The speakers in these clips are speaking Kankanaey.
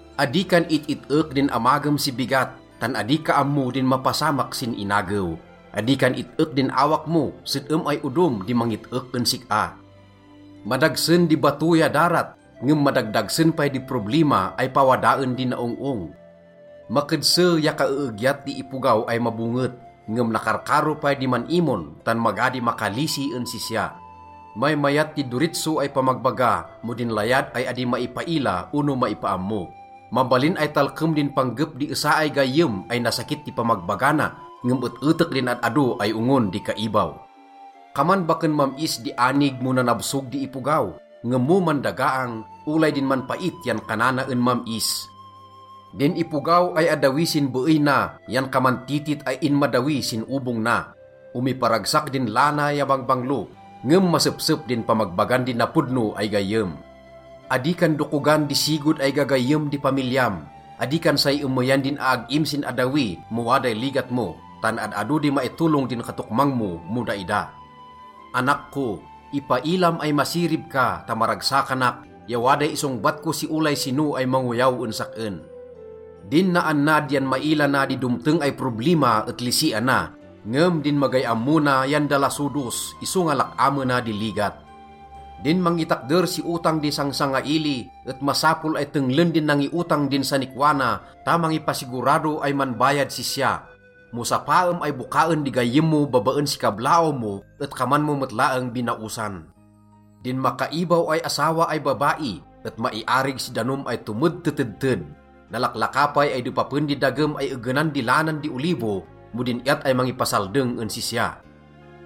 Adi kan it-it-ek din amagem si bigat, tan adi ka ammo din mapasamak sin inagew. Adi kan it-ek din awak mo, sed-em ay odom di mangit-ek en sik-a. Madagsen di bato ya darat, ngem madagdagsen pay di problima ay pawadaen di naong-ong. Makedse ya kaeegyat di ipogaw ay mabonget, ngem nakarkaro pay di man-imon, tan maga di makalisi en sisya. Maymayat di doritso ay pamagbaga mo din layad ay adi maipaila ono maipaammo. Mabalin ay talkem din panggep di esa ay gayyem ay nasakit di pamagbaga na, ngem et-etek din ad-ado ay ongon di kaibaw. Kaman baken mam-is di anig mo nanabsog di ipogaw, ngem mo mandagaang, olay din manpait yan kanana en mam-is. Din ipogaw ay addawi sin beey na yan kaman titit ay inmaddawi sin obong na. Omiparagsak din lana ya bangbanglo, ngem masepsep din pamagbagan di napodno ay gayyem. Adi kan dokogan di sigod ay gagayyem di pamilyam. Adi kan say emeyan din aag-im sin addawi mo waday ligat mo tan ad-ado di maitolong din katokmang mo mo daida. Anak ko, ipailam ay masirib ka ta maragsakanak ya waday isongbat ko si olay sino ay mangoyaw en sak-en. Din naannad yan maila na di domteng ay problima et lisiana, ngem din magay ammo na yan dalasodos, isonga lak-amena di ligat. Din mangitakder si otang di sangsangaili et masapol ay tenglen din nangiotang din sanikwa na ta mangipasigurado ay manbayad sisya. Mo sapaem ay bokaen di gayyem mo babaen si kablaaw mo et kaman mo met laeng binaosan. Din makaibaw ay asawa ay babai et maiarig si danom ay tomedtetedted. Nalaklaka pay ay depapen di dagem ya egenan di lanan di olivo mo din iyat ay mangipasaldeng en sisya.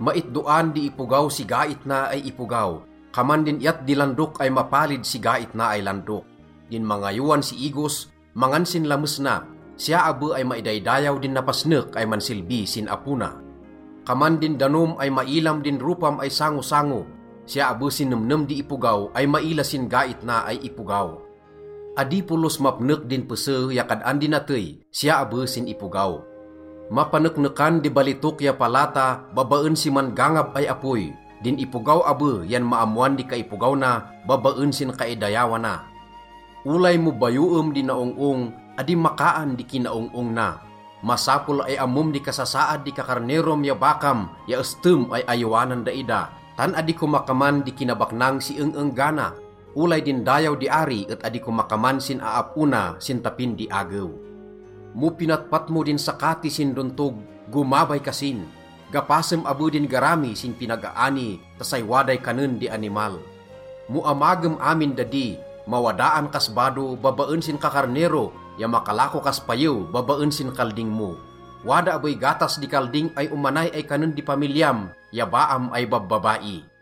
Maitdoan di ipogaw si gait na ay ipogaw, kaman din iyat di landok ay mapalid si gait na ay landok. Din mangayowan si igos, mangan sin lames na. Siya abe ay maidaydayaw din napasnek ay mansilbi sin apo na. Kaman din danom ay mailam din ropam ay sangosango, siya abe sin nemnem di ipogaw ay maila sin gait na ay ipogaw. Adi polos mapnek din pese ya kad-an di natey, siya abe sin ipogaw. Mapaneknekan di balitok ya palata babaen si man-gangab ay apoy, din ipogaw abe yan maammoan di kaipogaw na babaen sin kaidayawana. Olay mo bayoem di naong-ong, adi makaan di kinaong-ong na. Masapol ay ammom di kasasaad di kakarnerom ya bakam ya estem ay ayowanan daida, tan adi komakaman di kinabaknang si eng-enggana. Olay din dayaw di ari et adi komakaman sin aap-o na sin tapin di agew. Mo pinatpat mo din sakati sin dontog, gomabay kasin. Gapasem abe din garami sin pinag-aani ta say waday kanen di animal. Mo amagem amin dadi, mawadaan kas bado babaen sin kakarnero ya makalako kas payew babaen sin kalding mo. Wada abey gatas di kalding ay omanay ay kanen di pamilyam ya baam ay babbabai.